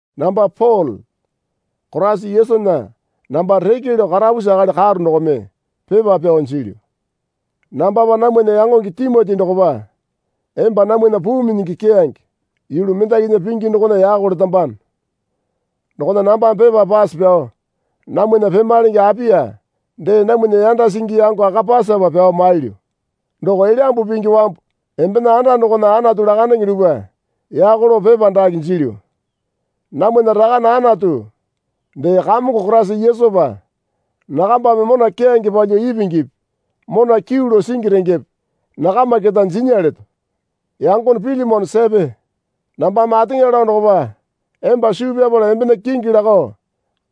Namba Pole Koraisa Yesunya namba reke lao karapusi akali karo dokome pepa pyao jilyu. Nambapa namwana yangonge Timoti dokopa emba namwana puu minyingi keyange yulu mendakinya pingi dokona yako letambano. Dokona nambame pepa pase pyao namwana pemalenge Apia dee namwana yanda singi yango Akapasapa pyao mailyu. Doko Elyambu Pingi wambu embena anda dokona Anatu lakandenge dupwa yako lao pepa dake jilyu. Namwana Rakane Anatu dee Kamongo Koraisa Yesupa nakambame mona keyange palyuo ipingipi mona kyuu lao singi rengepe nakama keta jinya leto. Yangone Pilimone sepe. Nambame ateŋa lao dokopa emba suu pyapala embena kingi lakao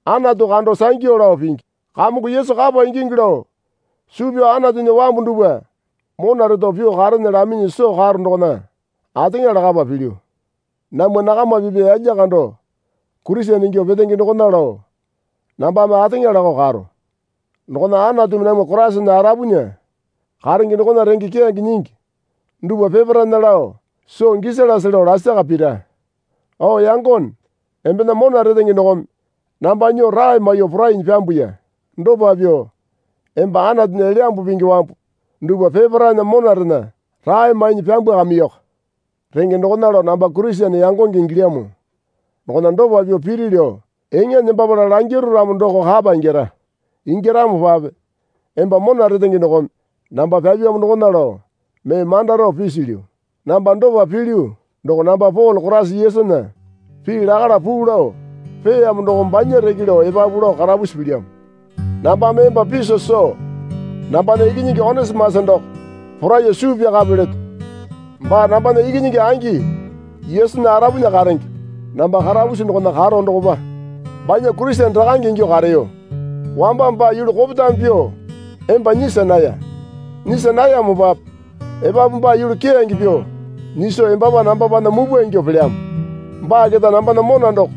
Anatu kando sangyu lao pingi. Kamongo Yesu kapa ingingi lao suu pyao Anatunya wambu dupwa mona reto pyuo karene laminyi soo karo dokona ateŋa lakapa pilyu. Namwa nakama pipya yalya kando Kurisene ingyuo petenge dokona lao nambame ateŋa lakao karo. Dokona Anatumi namwa Koraisana arapunya karenge dokona renge keyange nyingi dupwa peparaena lao soo gisalase lao lasaka pira. O yangone, embena mona retenge dokome namba nyuo rae maiyuo porainyi pyambuya. Dopa pyuo emba Anatunya Elyambu Pingi wambu dupwa peparaena monarena rae mainyi pyambwakamiyoko. Renge dokona lao namba Kurisene yangonge ingilyamo dokona dopa pyuo piri lao eŋa nembapala langiru ramo doko kapa ingyara. Ingyaramopape emba mona retenge dokome namba pyapyamo dokona lao mee manda rao pisilyu. Namba dopa pilyu doko namba Pole Koraisa Yesunya pii lakala puu lao peeyamo dokome banya reke lao epapu lao karapusi pilyamo. Nambame emba piso soo nambana ikinyingi Onisimasa doko poraiyuo suu pyakape leto. Baa nambana ikinyingi angi Yesunya arapunya karenge. Namba karapusi dokona karo dokopa banya Kurisene rakange ingyuo kareyo. Wamba baa yulu kopetame pyuo emba nyisa naya. Nyisa nayamopape epapu baa yulu keyange pyuo nyiso embapa nambapana mupwa ingyuo pelyamo. Baa keta nambana mona doko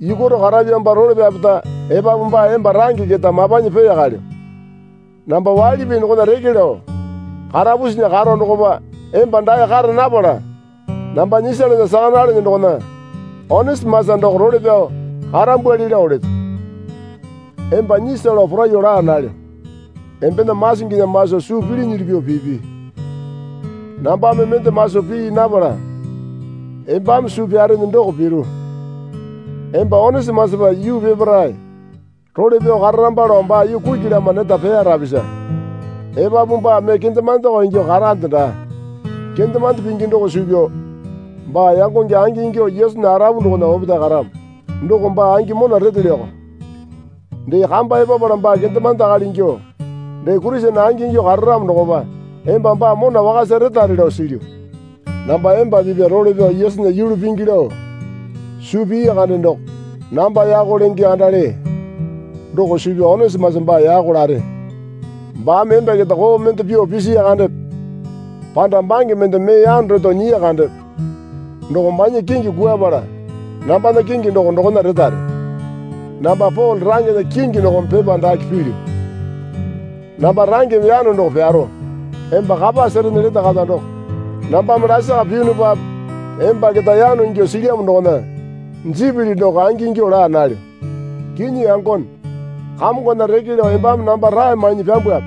yukwaro karapyamopa role pyapeta epapu baa emba range keta mapanyi peeyakalyo. Namba waili pii dokona reke lao karapusinya karo dokopa emba dae kara napala namba nyisalana saka nalene dokona Onisimasa doko role pyao karambwali lao leto. Emba nyisa lao poraiyuo laa nalyo. Embena masinginya maso suu pilinyili pyuo pipi. Nambame mende maso pii napala embame suu pyarene doko piru. Emba Onisimasapa yuu peparae role pyao kararamba lao baa yuu kuki lama neta peya rapisa. Epapu baa mee kendemandeko ingyuo karande daa. Kendemande pingi doko suu pyao baa yangonge angingyuo Yesunya arapu dokona opetae karamo. Doko baa angi mona retelyoko. Dee kamba epapala baa kendemande akali ingyuo dee Kurisene angingyuo kararamo dokopa emba baa mona wakasa retare lao silyu. Namba emba pipya role pyao Yesunya yulu pingi lao suu pii kande doko namba yako lenge kandale doko suu pyao Onisimasa baa yako lare. Baame emba keta koo mende pyuo pisiya kandepe panda bange mende mee yano reto nyiya kandepe doko banya kingi kwuapala nambana kingi doko dokona retare. Namba Pole rangena kingi dokome pepa dake pilyu. Namba rangeme yano doko pyaro. (Emba kapa serene lete kata doko nambame lasaka piyunupape emba keta yano ingyuo silyamo dokona jipili doko angingyuo laa nalyo.) Kinyi yangone Kamongona reke lao embame namba rae mainyi pyambwape.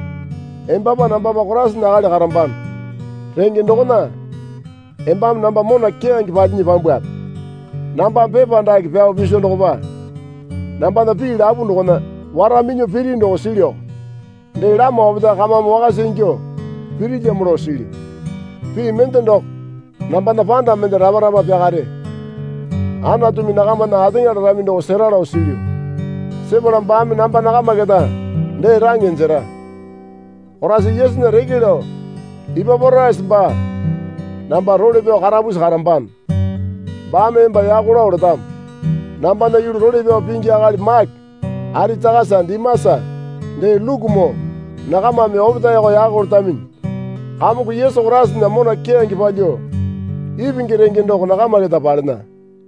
Embapa nambapa Koraisana akali karambano. Renge dokona embame namba mona keyange palinyi pyambwape. Nambame pepa dake pyao piso dokopa nambana pii lapu dokona wara minyuo piri doko silyuko. Dee lama opetae kamame wakasa ingyuo pirilyamo lao silyu. Pii mende doko, nambana panda mende rapa rapa pyakare. Anatumi nakamana ateŋa larami doko sera lao silyu. Sepala baame namba nakama keta dee range jera. Koraisa Yesunya reke lao Ipaporasa baa namba role pyao karapusi karambano. Baame emba yako lao letamo. Nambana yulu role pyao pingi akali Make Aritakasa Dimasa dee Lukumoo nakamame opetaeko yako letaminyi. Kamongo Yesu Koraisana mona keyange palyuo ipingi renge doko nakama keta palena.